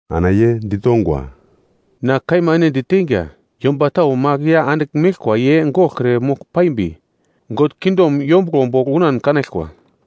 Ana ye ditongwa, “Na kaima ene diteinga, yomba tau magl ya andigl meglkwa ye goglkre mogl paimbi, God kingdom yombuglo bogl unan kanaglkwa.”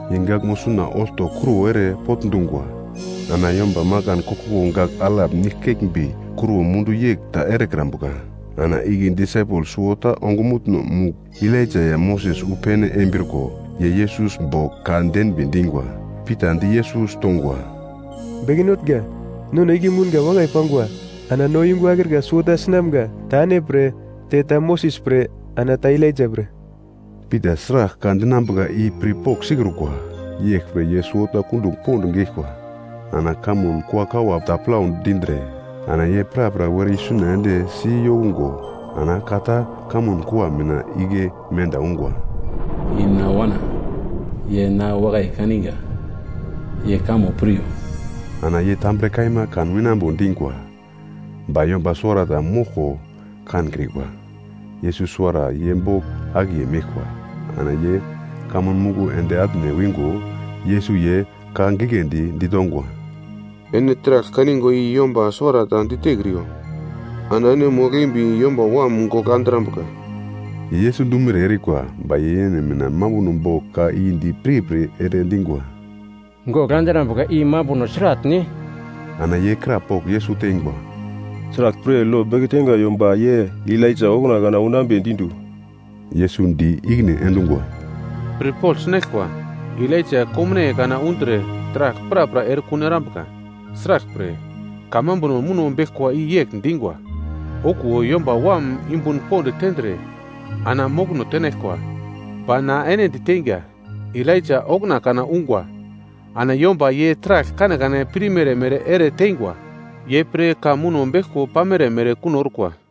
Ye gaglmo suna olto kruwo ere potndungwa. Ana yomba makan koglkoglo gagl alap nigl keglmbi kruwo mundu yegl ta erekrambuka. Ana igle disaipel suwota ongumutno-mugl Elaija ya Moses wu pene embriko, ye Yesus bogl ka denbi dingwa. Pita di Yesus tongwa, “Beke Notnga, nono igle mounga wakai pangwa. Ana no yungu akrika suwota sinamga, ta ene pre, te ta Moses pre, ana ta Elaija pre.” (Pita sragl ka dinambuka i pirpogl sikrukwa, yeglpre ye suwota kundugl pond geglkwa.) Ana kamun kuakawa ta plau dindre, ana ye prapra were isuna ende si yokungo ana ka ta kamun kua mina igle menda ungwa, “I na Wana, ye na wakai kaninga, ye kamo piryo.” Ana ye tambre kaima kan winambo dingwa, ba yomba suwarata moglko kankrikwa. Yesus suwara ye bogl akiye meglkwa. Ana ye kamun muglo ende atne wingo, Yesus ye ka giglendi ditongwa, “Ene taragl kanigwa i yomba suwarata ditekriyo, ana ene mogl-embi Yomba Wam gogl andrambuka.” Ye Yesus dumere erikwa, ba ye yene mina mambuno bogl ka i di pirpir ere dingwa, “Gogl andrambuka I mambuno sratne?” Ana ye krapogl Yesus teingwa, “Sraglpre lo beke teingwa yomba ye Elaija okuna kana unambedi du?” Yesus di ikine endungwa, “Pirpogl sinaglkwa, Elaija komnaiye kana undre taragl prapra erekun erambuka. Sraglpre, kamambuno muno beglkwa i yegl dingwa, ‘Okuwo Yomba Wam yumbun pond tendre ana mokono tenaglkwa?’ Ba na ene diteinga, Elaija okuna kana ungwa. Ana yomba ye taragl kanekane pirmere mere ere teingwa, ye pre ka muno beglko pamere mere kuno orkwa.”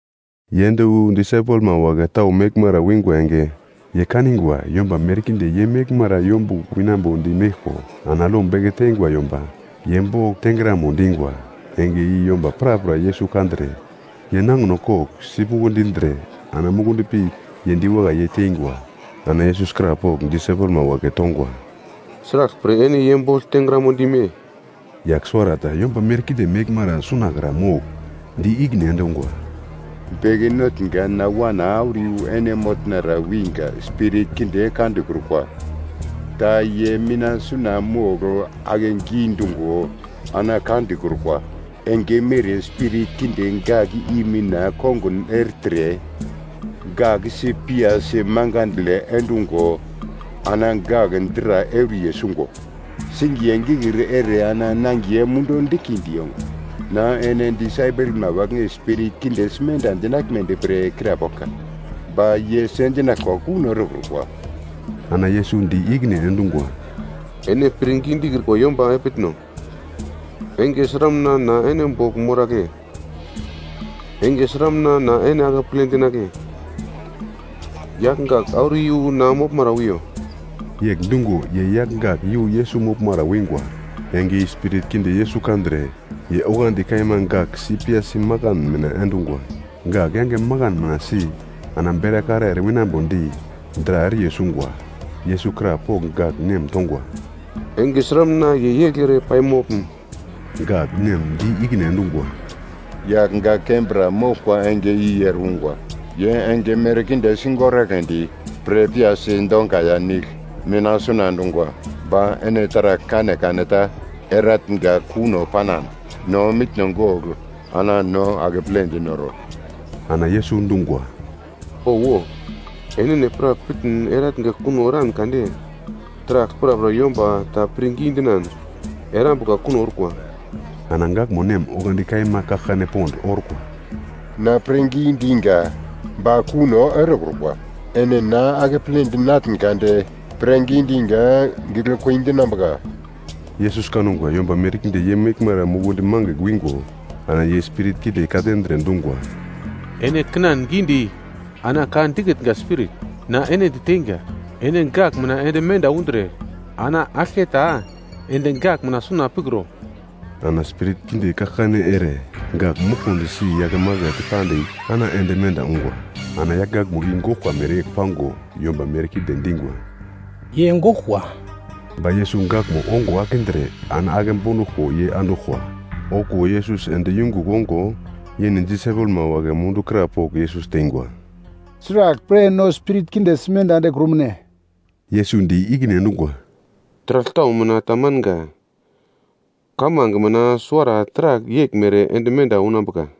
Ye ende wu disaipelma wagle tau meglmara wingwa enge, ye kanigwa yomba merkinde ye meglmara yombugl winambodi meglko ana lo beke teingwa yomba ye bogl tengramo dingwa. Enge i yomba prapra Yesus kandre, ye nangino kogl sipuglo dindre ana mukundi pi ye diwakai yei teingwa. Ana Yesus krapogl disaipelma wagle tongwa, “Sraglpre ene ye bogl tengramo dime?” Yagl suwarata yomba merkinde meglmara sunakra mogl di ikine endungwa, “Beke Notnga, na wana auro iyu ene motnara winga, spirit kinde ka dikrukwa ta ye mina suna mogl ake gidungo ana ka dikrukwa. Enge mere spirit kinde gak i mina kongun ertre gak si piyasi makandle endungo ana gak dra euriye sungo, singiye gikir ere ana nangiye mundu diglkindi yongwa. Na ene disaipelma wagle spirit kinde simenda endinaglmedi pre krapoglka, ba ye sendinaglkwa kuno erekrukwa.” Ana Yesus di ikine endungwa, “Ene pirngi dikrikwa yomba epitno. Enge sramuna na ene bogl moragle? Enge sramuna na ene akeple dinagle? Yagl gak auro iyu na moglmara wiyo.” Yegl dungo ye yagl gak iyu Yesus moglmara wingwa. Enge i spirit kinde Yesus kandre, ye oglandi kaima gak si piyasi makan mina endungwa. Gak yange makan mina si ana berakara ere winambodi, dra euriye sungwa. Yesus krapogl gak nem tongwa, “Enge sramuna ye yegl ere pai moglum?” Gak nem di ikine endungwa, “Yagl gak kembra moglkwa enge i ere ungwa. Ye enge merkinde sigoragledi pre piyasi donga ya nigl mina suna endungwa. Ba ene taragl kanekane ta eratnga kuno panan, no mitno gogl ana no akeple dinoro.” Ana Yesus dungwa, “Owo, enene pra pitn eratnga kuno eran kande, taragl prapra yomba ta pirngi dinan erambuka kuno orkwa.” Ana gakmo nem oglandi kaima kaglkane pond orkwa, “Na pirngi dinga, ba kuno erekrukwa, ene na akeple dinatn kade pirngi dinga giglekui dinambuka!” Yesus kangwa yomba merkinde ye meglmara mukundi mangigl wingo ana ye spirit kinde ka-tendre, dungwa, “Ene kinan gidi ana ka dikitnga spirit. Na ene diteinga, ene gak mina ende menda undre, ana aglketa ende gak mina suna pikro.” Ana spirit kinde kaglkane ere, gak muglkumdi si yakemakete pandigl ana ende menda ungwa. Ana yagl gakmo i goglkwa mereyegl pango yomba merkinde dingwa, “Ye goglkwa.” Ba Yesus gakmo ongo akindre ana ake bonduglko ye anduglkwa. Okuwo Yesus ende yungugl ongo, yene disaipelma wagle mundu krapogl Yesus teingwa, “Sraglpre no spirit kinde simenda endekrumune?” Yesus di ikine endungwa, “Taragl tau mina tamanga, kamange mina suwara taragl yeglmere ende menda unambuka.”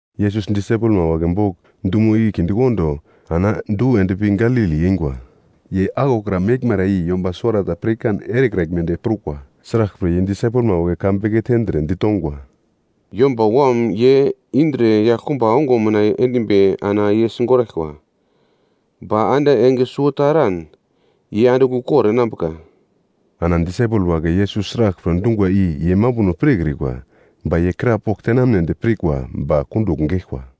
Yesus disaipelma wagle bogl dumo igle kindekondo ana du endpi Galili eingwa. Ye aglokra meglmara i yomba suwarata pirkan erekraglmedi prukwa, sraglpre ye disaipelma wagle ka beke tendre, ditongwa, “Yomba Wam ye indre yaglkumba onguno mina endimbi ana ye sigoraglkwa, ba ande enge suwota eran ye andigl ukor enambuka.” Ana disaipel wagle Yesus sraglpre dungwa i ye mambuno pirkrikwa, ba ye krapogl tenamnedi pirkwa ba kundugl geglkwa.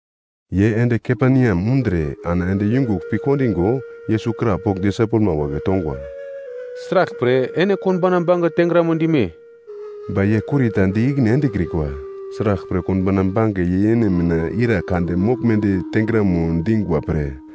Ye ende Kaperneam undre ana ende yungugl pi kondingo, Yesus krapogl disaipelma wagle tongwa, “Sraglpre ene konbauna bange tengramo dime?” Ba ye kurita di ikine endekrikwa, sraglpre konbauna bange ye yene mina ira kande moglmedi tengramo dingwa pre.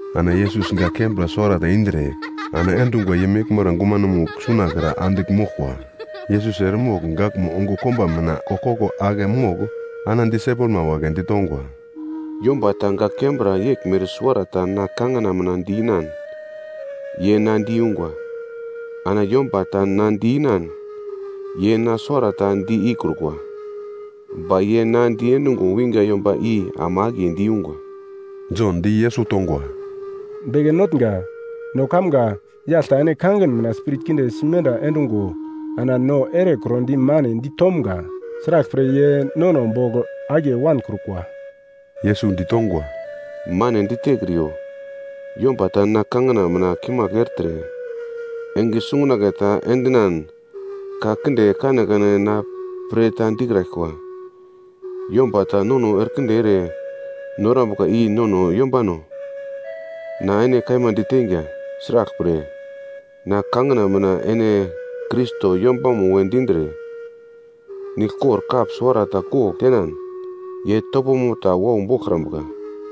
Ana Yesus gak kembra suwarata indre ana endungwa ye meglmara gumanomugl sunakra andigl moglkwa. Yesus eremogl gakmo ongo komba mina koglkoglo ake mogl ana disaipelma wagle ditongwa, “Yomba ta gak kembra yeglmere suwarata na kangina mina di-inan, ye na diyungwa. Ana yomba ta na di-inan, ye na suwara ta di ikrukwa, ba ye na diendungo winga yomba i ama akiye diyungwa.” Jon di Yesus tongwa, “Beke Notnga, no kamga, yagl ta ene kangin mina spirit kinde simenda endungo ana no erekrodi mane ditomga. Sraglpre ye nono bogl akiye wankrukwa.” Yesus ditongwa, “Mane ditekriyo, yomba ta na kangina mina kimagl ertre, enge sungunagle ta endinan ka kinde kanekane na pre ta dikraglkwa. Yomba ta nono erekinde ere norokrambuka i nono yombano. Na ene kaima diteinga sraglpre, na kangina mina ene Krais yombamo we dindre, niglkor kap suwarata kogl tenan, ye topomo ta wau boglkrambuka.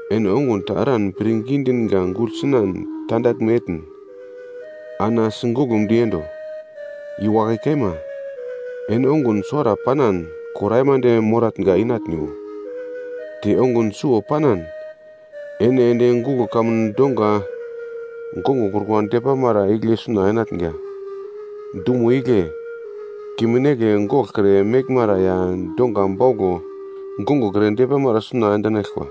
Ene ongun ta eran pirngi dinga gugl sinan tandaglme etn, ana sigoglumdi endo. I wakai kaima, ene ongun suwara panan kor aimande moratnga inatniwo. Te ongun suwo panan ene ende guglo kamun donga gongokrukwa depamara igle suna enatnga. Dumo igle kimin negle goglkre meglmara ya donga bauglo gongokre depamara suna endinaglkwa.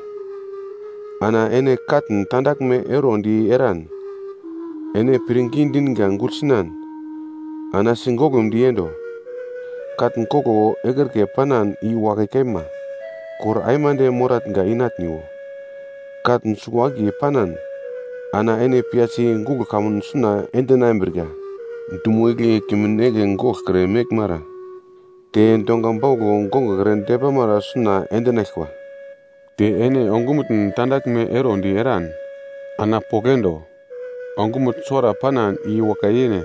Ana ene katn tandaglme erondi eran, ene pirngi dinga gugl sinan, ana sigoglumdi endo. Katn koglo ekrike panan i wakai kaima, kor aimande moratnga inatniwo. Katn suwo-akiye panan ana ene piyasi guglo kamun suna endinambrika. Dumo igle kimin negle goglkre meglmara te donga bauglo gongokre depamara suna endinaglkwa. Te ene ongumutn tandaglme erondi eran ana pogl endo. Ongumutn suwara panan i wakai yene,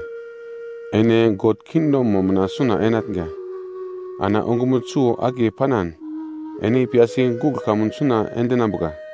ene God kingdomo mina suna enatnga. Ana ongumutn suwo-akiye panan ene piyasi guglo kamun suna endinambuka.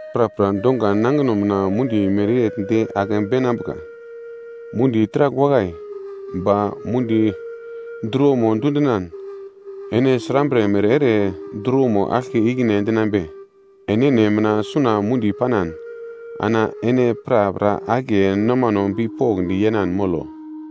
Prapra donga nangino mina mundi mereyegl de ake beinambuka. “Mundi taragl wakai. Ba mundi druwomo dundinan, ene srambre mere ere druwomo aglke ikine endinambe? Enene mina suna mundi panan, ana ene prapra akiye nomano bipokndi yenan molo.”